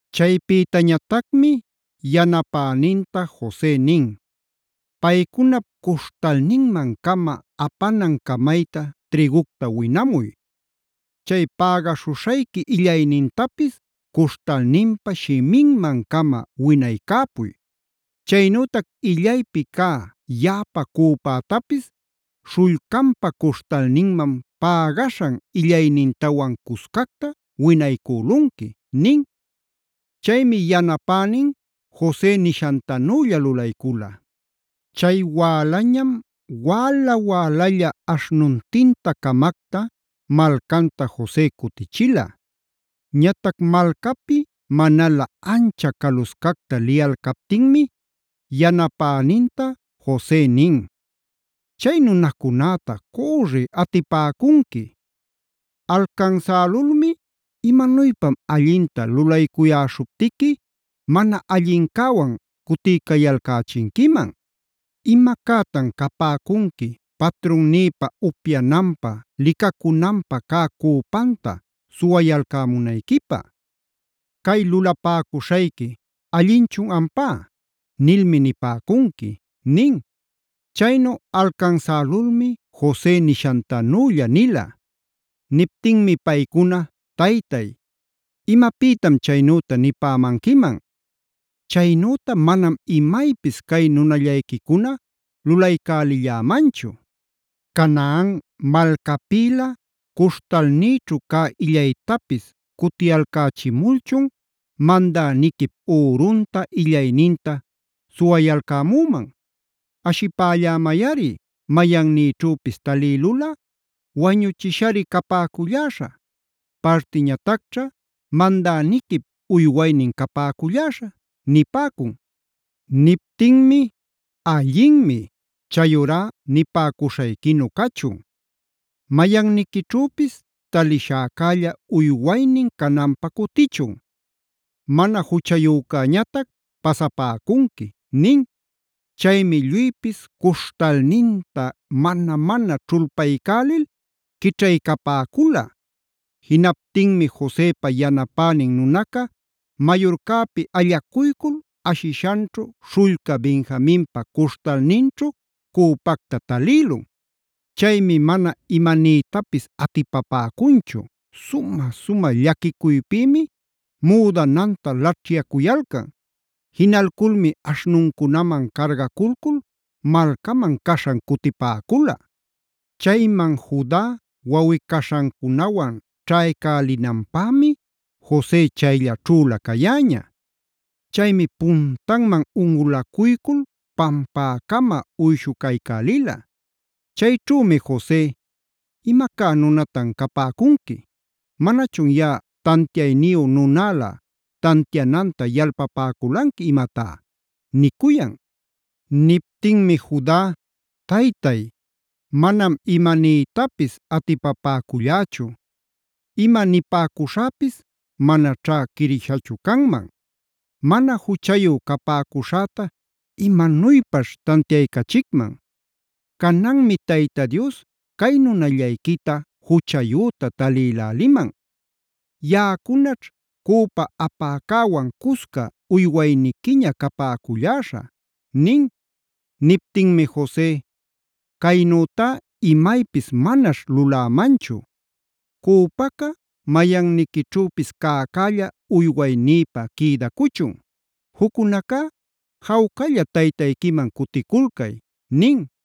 Chaypïtañatacmi yanapäninta Jose nin: “Paycunap cuśhtalninman-cama apanan camayta trïgucta winamuy. Chay pägaśhuśhayqui illaynintapis cuśhtalninpa shiminman-cama winaycäpuy. Chaynütac illaypi cä yaꞌapa cüpätapis śhullcanpa cuśhtalninman pägaśhan illaynintawan cuscacta winaycülunqui” nin. Chaymi yanapänin Jose nishantanülla lulaycula. Chay wälañam wäla-wälalla aśhnuntin-camacta malcanta Jose cutichila. Ñatac malcapi manalä ancha caluscacta liyalcaptinmi yanapäninta Jose nin: “Chay nunacunäta cürri atipäcunqui. Alcansälulmi: ‘¿Imanuypam allinta lulaycuyäśhuptiqui mana allincäwan cutiycayalcächinquiman? ¿Imacätan capäcunqui patrunnïpa upyananpä, licacunanpä cä cüpanta suwayalcämunayquipä? ¡Cay lulapäcuśhayqui allinchun ampá!’ nilmi nipäcunqui” nin. Chaynu alcansälulmi Jose nishantanülla nila. Niptinmi paycuna: “Taytay, ¿imapïtam chaynüta nipämanquiman? Chaynüta manam imaypis cay nunallayquicuna lulaycälillämanchu. Canaan malcapïla cuśhtalnïćhu cä illaytapis cutiyalcächimulchun ¿mandäniquip ürunta, illayninta suwayalcämüman? Ashipällämayꞌari, mayannïćhüpis talïlulꞌa wañuchishari capäculläśhä. Partiñatacćha mandäniquip uywaynin capäculläśhä” nipäcun. Niptinmi: “Allinmi, chayurá nipäcuśhayquinu cachun. Mayanniquićhüpis taliśhäcälla uywaynin cananpä cutichun. Mana juchayücäñatac pasapäcunqui” nin. Chaymi lluypis cuśhtalninta mana-mana ćhulpaycälil quićhaycapäcula. Jinaptinmi Josepa yanapänin nunaca, mayurcäpi allacuycul ashishanćhu śhullca Benjaminpa cuśhtalninćhu cüpacta talïlun. Chaymi mana imanïtapis atipapäcunchu; sumä-sumä llaquicuypïmi müdananta laćhyacuyalcan. Jinalculmi aśhnuncunaman cargaculcul malcaman caśhan cutipäcula. Chayman Juda wawꞌi-caśhancunawan ćhaycälinanpämi Jose chayllaćhüla cayäña. Chaymi puntanman unꞌulacuycul pampäcama uyshucaycälila. Chayćhümi Jose: “¿Imacá nunatan capäcunqui? ¿Manachun yaꞌa tantiayniyu nunälä tantiananta yalpapäculanqui imatá?” nicuyan. Niptinmi Juda: “Taytay, manam imanïtapis atipapäcullächu. ¡Ima nipäcuśhäpis manaćhá quirishachu canman! ¿Mana juchayu capäcuśhäta imanuypaćh tantiaycachicman? Cananmi Tayta Dios cay nunallayquita juchayüta talïläliman. Yaꞌacunaćh cüpa apäcäwan cusca uywayniquiña capäculläśha” nin. Niptinmi Jose: “Caynütá imaypis manaćh lulämanchu, cüpaca mayanniquićhüpis cäcälla uywaynïpä quïdacuchun. Juccunacá jawcalla taytayquiman cuticulcay” nin.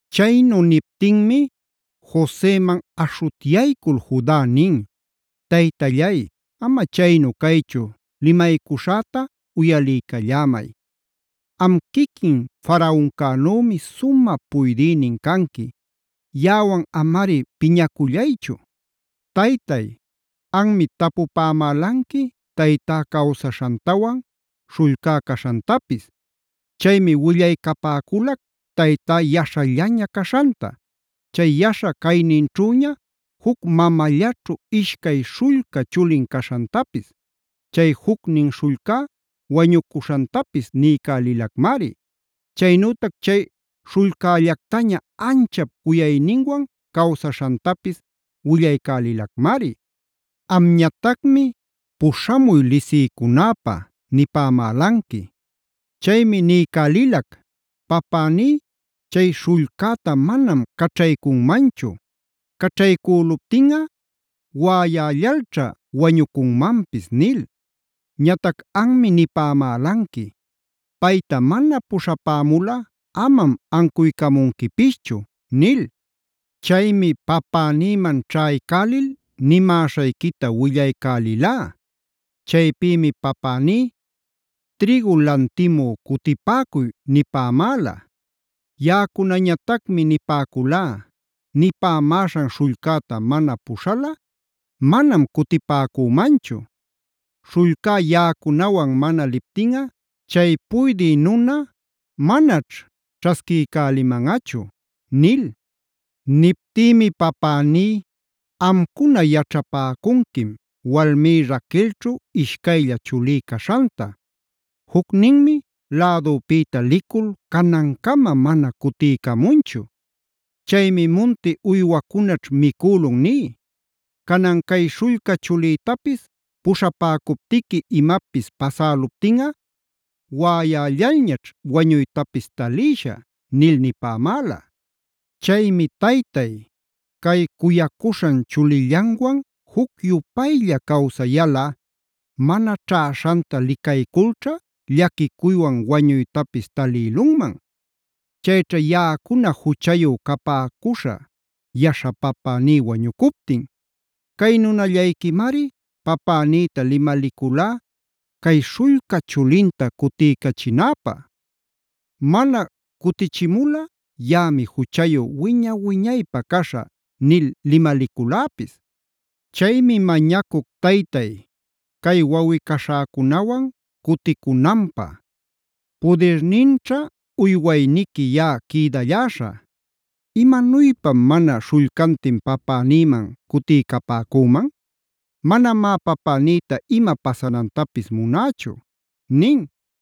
Chaynu niptinmi Joseman aśhutyaycul Juda nin: “Taytallay, ama chaynu caychu limaycuśhäta uyaliycallämay. Am quiquin Faraoncänümi sumä puydïnin canqui, yaꞌawan amari piñacullaychu. Taytay, anmi tapupämälanqui taytá cawsaśhantawan, śhullcá caśhantapis. Chaymi willaycapäculac taytá yaśhallaña caśhanta. Chay yaśha cayninćhüña juc mamallaćhu ishcay śhullca chulin caśhantapis, chay jucnin śhullcá wañucuśhantapis niycälilacmari. Chaynütac chay śhullcällactaña anchap cuyayninwan cawsaśhantapis willaycälilacmari. Amñatacmi ‘puśhamuy lisiycunäpä’ nipämälanqui. Chaymi niycälilac ‘Papäní chay śhullcäta manam caćhaycunmanchu. Caćhaycüluptinꞌa waꞌayällalćha wañucunmanpis’ nil. Ñatac anmi nipämälanqui: ‘Payta mana puśhapämulꞌa, amam ancuycamunquipischu’ nil. “Chaymi papänïman ćhaycälil nimäśhayquita willaycälilá. Chaypïmi papäní: ‘Trïgu lantimü cutipäcuy’ nipämäla. Yaꞌacunañatacmi nipäculá: ‘Nipämäśhan śhullcäta mana puśhalꞌa manam cutipäcümanchu. Śhullcá yaꞌacunawan mana liptinꞌa chay puydï nuna manaćh ćhasquiycälimanꞌachu’ nil. Niptïmi papäní: ‘Amcuna yaćhapäcunquim walmí Raquelćhu ishcaylla chulí caśhanta. Jucninmi lädupïta licul canancama mana cutiycamunchu. Chaymi munti uywacunaćh micülun ní. Canan cay śhullca chulïtapis puśhapäcuptiqui imapis pasäluptinꞌa waꞌayällalñaćh wañuytapis talïshä’ nil nipämäla. “Chaymi taytay, cay cuyacuśhan chulillanwan juc-yupaylla cawsayalꞌa, mana ćhäśhanta licayculćha llaquicuywan wañuytapis talïlunman. Chayćha yaꞌacuna juchayu capäcuśhä yaśha papäní wañucuptin. Cay nunallayquimari papänïta limaliculá cay śhullca chulinta cutiycachinäpä: ‘Mana cutichimulꞌa yaꞌami juchayu wiña-wiñaypä caśhä’ nil limaliculäpis. Chaymi mañacuc taytay, cay wawꞌi-caśhäcunawan cuticunanpä, pudirninćha uywayniqui yaꞌa quïdalläśhä. ¿Imanuypam mana śhullcantin papänïman cutiycapäcüman? Manamá papänïta ima pasanantapis munächu” nin.